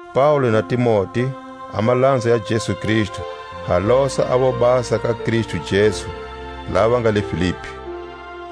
Paule na Timote, a malanza ya Jesu Kristu, ha losa a vobasa ka Kristu Jesu, lava va nga le Filipi,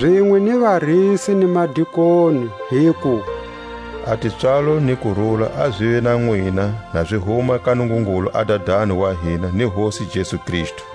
zinwe ni varisi ni madikoni, hiku: A tipswalo ni kurula a zive na nwina na zi huma ka Nungungulu a Dadani wa hina ni Hosi Jesu Kristu,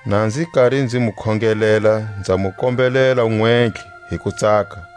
Na nzi kari nzi mu khongelela nza mu kombelela nwentlhe hi kutsaka,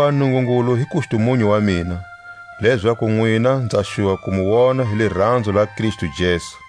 Hakuva Nungungulu hi kustumunyu wa mina, lezaku nwina nza xuva ku mu wona hi liranzo la Kristu Jesu.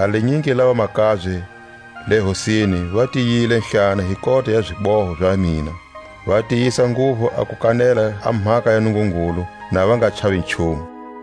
A linyingi la vamakabye le Hosini va tiyilehlana hi kota ya ziboho za mina, va tiyisa nguvu a ku kanela a mhaka ya Nungungulu na va nga chavi nchumu.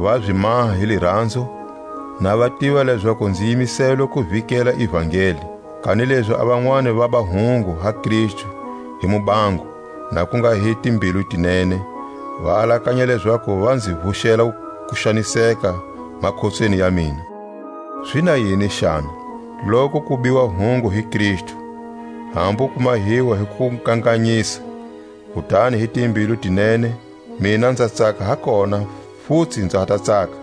Va zi maha hi liranzo, na va tiva lezaku nzi yimiselwe ku vikela ivangeli; kanilezi a vanwani vaba hungu ha Kristu hi mubango, na ku nga hi timbilu ti nene, va alakanya lezaku va nzi vuxela kuxaniseka makhotsweni ya mina. Zi na yini xana? Loku ku biwa hungu hi Kristu, hambu ku mahiwa hi kukanganyisa, kutani hi timbilu ti nene, mina nza tsaka ha kona, futsi nza ha ta tsaka.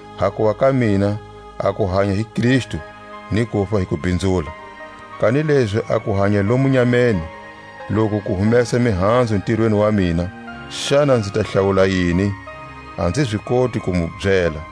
Hakuva ka mina, a ku hanya hi Kristu, ni kufa hi kubhinzula. Kanilezi a ku hanya lomu nyameni, loku ku humesa mihanzu ntirweni wa mina, xana nzi ta hlawula yini? A nzi zi koti ku mu byela.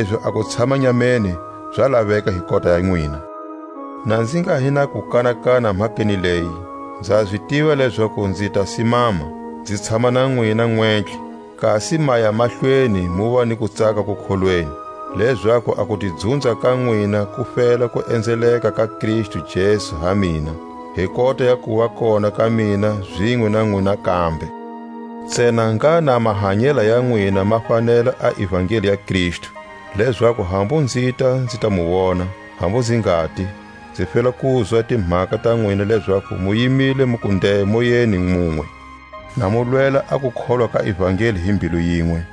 kanilezi a ku tshama nyameni za laveka hi kota ya nwina. Na nzi nga hi na kukanakana mhakeni leyi, nza zi tiva lezaku nzi ta simama, nzi tshama na nwina nwentlhe, kasi maya mahlweni muva ni kutsaka kukholweni; lezaku a kutidzunza ka nwina ku fela ku enzeleka ka Kristu Jesu ha mina, hi kota ya kuva kona ka mina zinwe na nwina kambe. Ntsena ngha na mahanyela ya nwina ma fanela a ivangeli ya Kristu; lezaku hambu nzita nzi ta mu wona, hambu nzi ngati, nzi fela kuzwa timhaka ta nwina lezaku mu yimile muku nde moyeni munwe, na mu lwela a kukholwa ka ivangeli hi mbilu yinwe,